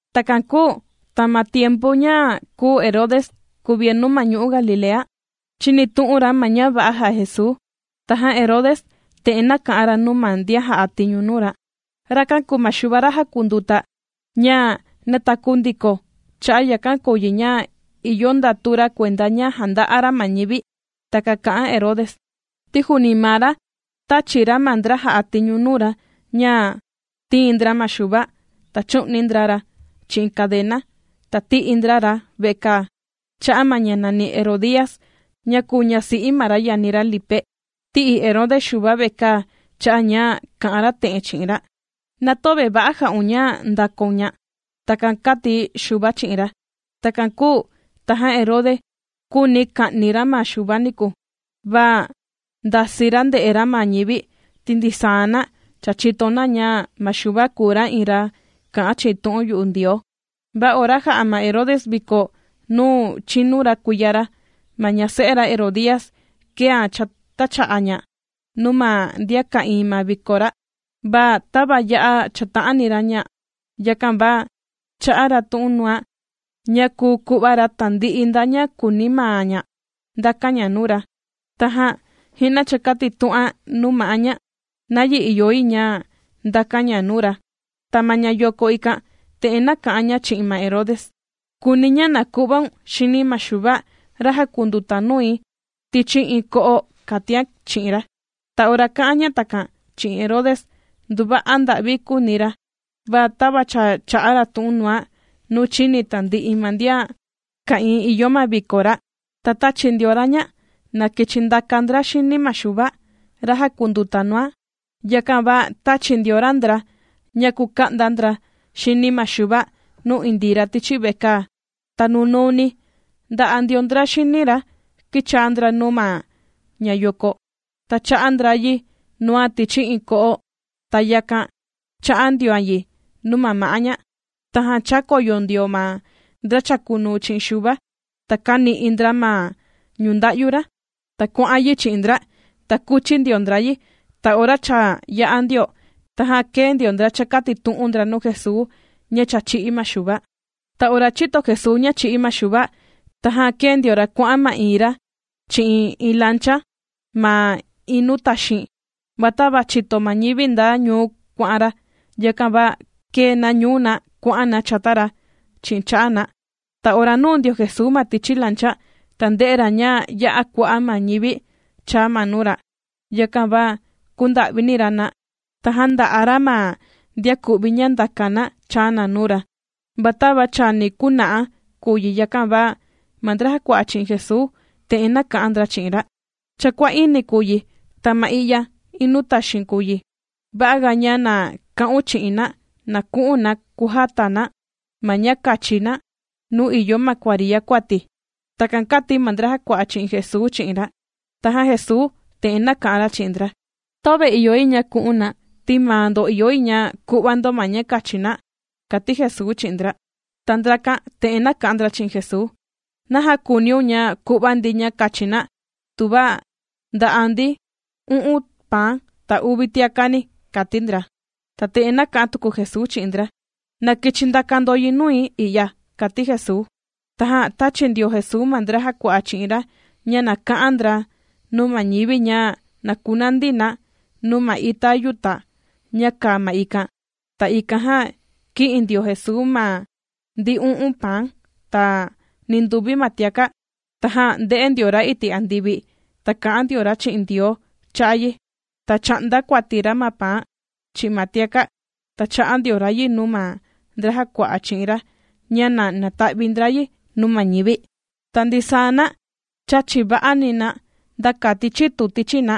Takan kūu ta ma tiempu ña kùu Herode kuvienu ma ñu'u' Galilea, chīnitu'un ra ma ña va'a jà'a Jesuu, tajan Herode te'en nāka'an ra nuu ma ndian jà'a tiñu nuu ra: ―Rakan kùu ma Xuva ra jàkunduta, ña ja nātaku ndiko. Cha'a' yakan kùu yi ña ìyo ndatu ra kuenda ña jànda'a ra ma ñivi. Takan kà'an Herode, ti juuni maa ra tāchi ra ma ndra jà'a tiñu nuu ra ña tīin ndra ma Xuva, ta chū'ni ndra ra chi'in kadena, ta tī'i ndra ra vekaa, cha'a' ma ña nàni Herodías ña kūu ñasi'i ma ra yani ra Lipe. Tī'i Herode Xuva vekaa cha'a' ña kā'an ra te'en chi'in ra: ―Na töve va'a jà'un, ña ndàkaun ña. ―Takan kāti Xuva chi'in ra. Takan kūu tajan Herode, kūuni ka'ni ra ma Xuva niku, va ndasii ra ndè'e ra ma ñivi, ti ndisaa na cha chìto na ña ma Xuva kùu ra iin ra kà'an chi'in tu'un yu'u Ndioo. Va ora jā'a ma Herode viko nuu chīnu ra kuiya ra, ma ña se'e Herodías, kēan chātacha'a ña nuu ma ndian ka'ìin ma viko ra. Va tava ya'a chāta'ani ra ña, yakan va chā'a ra tu'un nuan ña kùu ku'va ra tandi'i nda ña kùuni maa ña ndakan ña nuu ra. Tajan ji'na chākatitu'an nuu ma'á ña nayi ìyo yi ña ndakan ña nuu ra. Ta ma ña yoko ikan, te'en nāka'an ña chi'in ma Herode: ―Kùuni̱ ña na ku'vaun xini ma Xuva, ra jàkunduta nui tichi iin ko'o ―kàtian chi'in ra. Ta ora kā'an ña takan chi'in Herode, nduva'a nda'vi kūuni ra, va tava cha chā'a ra tu'un nuan, nuu chīni tandi'i ma ndian ka'ìin nuu ìyo ma viko ra, ta tāchi ndio ra ña na kichi ndaka ndra xini ma Xuva ra jàkunduta nuan. Yakan va tāchi ndio ra ndra ña kuka'nda ndra xini ma Xuva nuu indii ra tichi vekaa. Ta nunuuni, ndà'a ndio ndra xini ra kīchaa ndra nuu ma ña yoko, ta chā'a ndra yi nuan tichi iin ko'o, ta yakan chā'a ndioan yi nuu ma ma'á ña. Tajan chākoyo ndio ma ndra chàkunuu chi'in Xuva, ta kāni'i ndra ma ñunda'yu ra, ta kuà'an yi chi'in ndra, ta kūchi ndio ndra yi. Ta ora cha yā'a ndio, tajan kēe ndio ndra chākatitu'un ndra nuu Jesuu ña cha chī'í ma Xuva. Ta ora chīto Jesuu ña chī'í ma Xuva, tajan kēe ndio ra kuà'an ma'iin ra chi'in iin lancha ma iin nuu taxiin. Va tava chīto ma ñivi nda ñuu kuà'an ra, yakan va kēe na ñuu na kuà'an na chata ra chi'in cha'a' na. Ta ora nūu ndio Jesuu ma tichi lancha, ta ndē'e ra ña ya'a kua'a' ma ñivi chāa ma nuu ra. Yakan va kūnda'vini ra na, ta jānda'a ra ma ndian ku'vi ña ndàka na chāa na nuu ra. Va tava chani kuna'a kùu yi, yakan va ma ndra jàkua'a chi'in Jesuu, te'en nāka'an ndra chi'in ra: ―Cha kuà'ini kùu yi, ta ma i'ya iin nuu taxiin kùu yi. Va'a ga ña na ka'un chi'in na, na ku'un na kujata na ma ña kachi na nuu ìyo ma kuariya kuati. ―Takan kàti ma ndra jàkua'a chi'in Jesuu chi'in ra. Tajan Jesuu te'en nāka'an ra chi'in ndra: ―Töve ìyo yi ña ku'un na, ti maa ndo ìyo yi ña ku'va ndo ma ña kachi na ―kàti Jesuu chi'in ndra. Ta ndrakan te'en nāka'an ndra chi'in Jesuu: ―¿Naja kùuniun ña ku'va ndi ña kachi na, tuva ndà'a ndi u'un paan, ta uvi tiakani? ―kàti ndra. Ta te'en nāka'an tuku Jesuu chi'in ndra: ―Na kichi ndaka ndo yi nui i'ya ―kàti Jesuu. Tajan tāchi ndio Jesuu ma ndra jàkua'a chi'in ra ña na ka'an ndra nuu ma ñivi ña na kunandi na nuu ma ita yuta' ña kàa ma ikan. Ta ikan jan kī'in ndio Jesuu ma ndi u'un paan, ta ninduvi ma tiaka', tajan ndē'e ndio ra iti' andivi, ta kā'an ndio ra chi'in Ndioo cha'a' yi, ta chā'nda kuati ra ma paan, chi'in ma tiaka', ta chā'a ndio ra yi nuu ma ndra jàkua'a chi'in ra ña na nata'vi ndra yi nuu ma ñivi. Ta ndisaa na chāchi nda'a va'ani na nda kati chitu tichi na.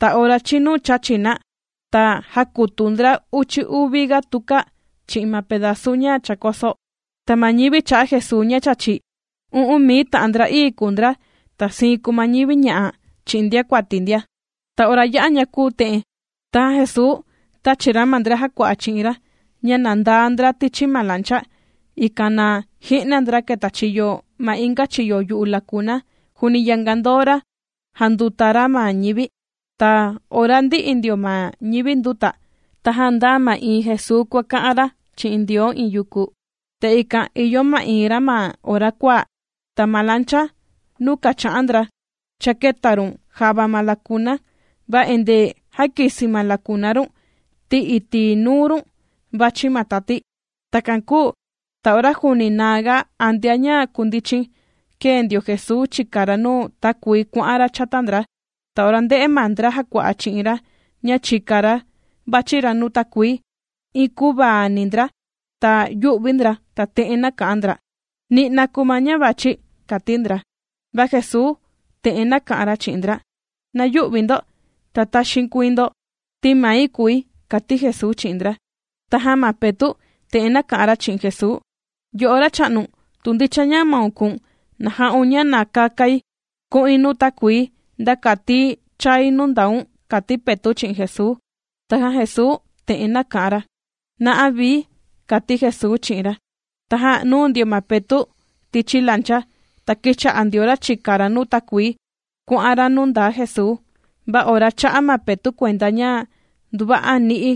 Ta ora chīnu chāchi na, ta jākutua ndra uchi uvi ga tuka chi'in ma pedazu ña chākoso. Ta ma ñivi chā'a Jesuu ña chāchi, u'un mii ta'an ndra'ii kùu ndra, ta siin kùu ma ñivi ña'a chi'in ndiakuati ndia. Ta ora yā'a ña kūu te'en, tajan Jesuu tāchi ra ma ndra jàkua'a chi'in ra ña na ndaa ndra tichi ma lancha, ikan na ji'na ndra ketachiyo ma inga chiyo yu'u lakuna, juuni yanga ndoo ra jànduta ra ma ñivi. Ta ora cha ndī'i ndio ma ñivi ndūta, tajan ndāa ma'iin Jesuu kuàka'an ra chi'in Ndioo iin yuku. Ta ikan ìyo ma'iin ra ma ora kuaa. Ta ma lancha nuu kàcha'an ndra, cha kēta run java ma lakuna, va endee jàkisi ma lakuna run, ti iti' nuu run vàchi ma tati. Takan kūu ta ora juuni naa ga antea ña kundichin, kēe ndio Jesuu chìka ra nuu takuii kuà'an ra chata ndra. Ta ora ndē'e ma ndra jàkua'a chi'in ra ña chìka ra vàchi ra nuu takuii, iin kuvaani ndra, ta yū'vi ndra, ta te'en nāka'an ndra: ―¡Ni'na kùu ma ñá' vàchi! ―kàti ndra. Va Jesuu te'en nāka'an ra chi'in ndra: ―¡Na yü'vi ndo ta taxiin kuii ndo!, ti mai kùi ―kàti Jesuu chi'in ndra. Tajan ma Petu' te'en nāka'an ra chi'in Jesuu: ―Yo'o Racha'nu, tu ndicha ña maun kùu̱n, na ja'un ña na kakai ku'in nuu takuii, nda kati chai nuu ndaun ―kàti Petu' chi'in Jesuu. Tajan Jesuu te'en nāka'an ra: ―Na'a vii ―kàti Jesuu chi'in ra. Tajan nūu ndio ma Petu' tichi lancha, ta kīcha'a ndio ra chìka ra nuu takuii kuà'an ra nuu ndaa Jesuu. Va ora chā'a ma Petu' kuenda ña nduva'a ni'i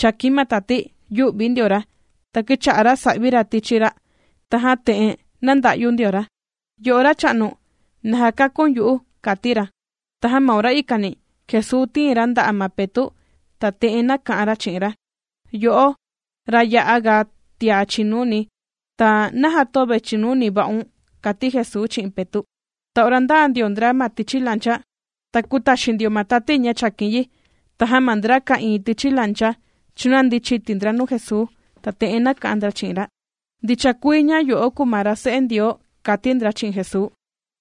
chàkin ma tati, yū'vi ndio ra, ta kīcha'a ra sà'vi ra tichi ra'. Tajan te'en nānda'yu ndio ra: ―¡Yo'o Racha'nu, na jakakun yu'u! ―kàti ra. Tajan ma ora ikani, Jesuu tīin ra nda'a ma Petu', ta te'en nāka'an ra chi'in ra: ―¡Yo'o, ra ya'a ga tia chìnuni! Ta, ¿naja töve chìnuni va'un? ―kàti Jesuu chi'in Petu'. Ta ora ndāa ndio ndra ma tichi lancha, ta kūtaxin ndio ma tati ña chàkin yi. Tajan ma ndra ka'ìin tichi lancha, chūnandi chiti ndra nuu Jesuu, ta te'en nāka'an ndra chi'in ra: ―¡Ndicha kuii ña yo'o kùu ma ra Se'e Ndioo! ―kàti ndra chi'in Jesuu.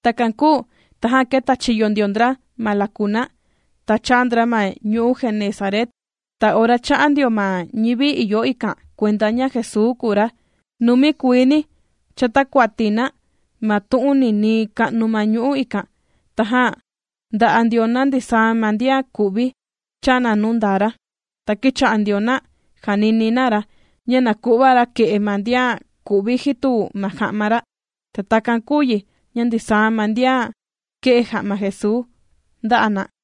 Takan kūu tajan kētachiyo ndio ndra ma lakuna ikan, ta chāa ndra ma ñu'u' Genesaret. Ta ora chā'a ndio ma ñivi ìyo ikan kuenda ña Jesuu kùu ra, numi kuiini chātakuati na ma tu'un ninii ka'nu ma ñu'u' ikan. Tajan ndà'a ndio na ndisaa ma ndian ku'vi, chàa na nuu ndaa ra. Ta kīcha'a ndio na jànini na ra, ña na ku'va ra kè'e ma ndian ku'vi jitu ma ja'ma ra. Ta takan kūu yi ña ndisaa ma ndian kē'e ja'ma Jesuu ndā'a na.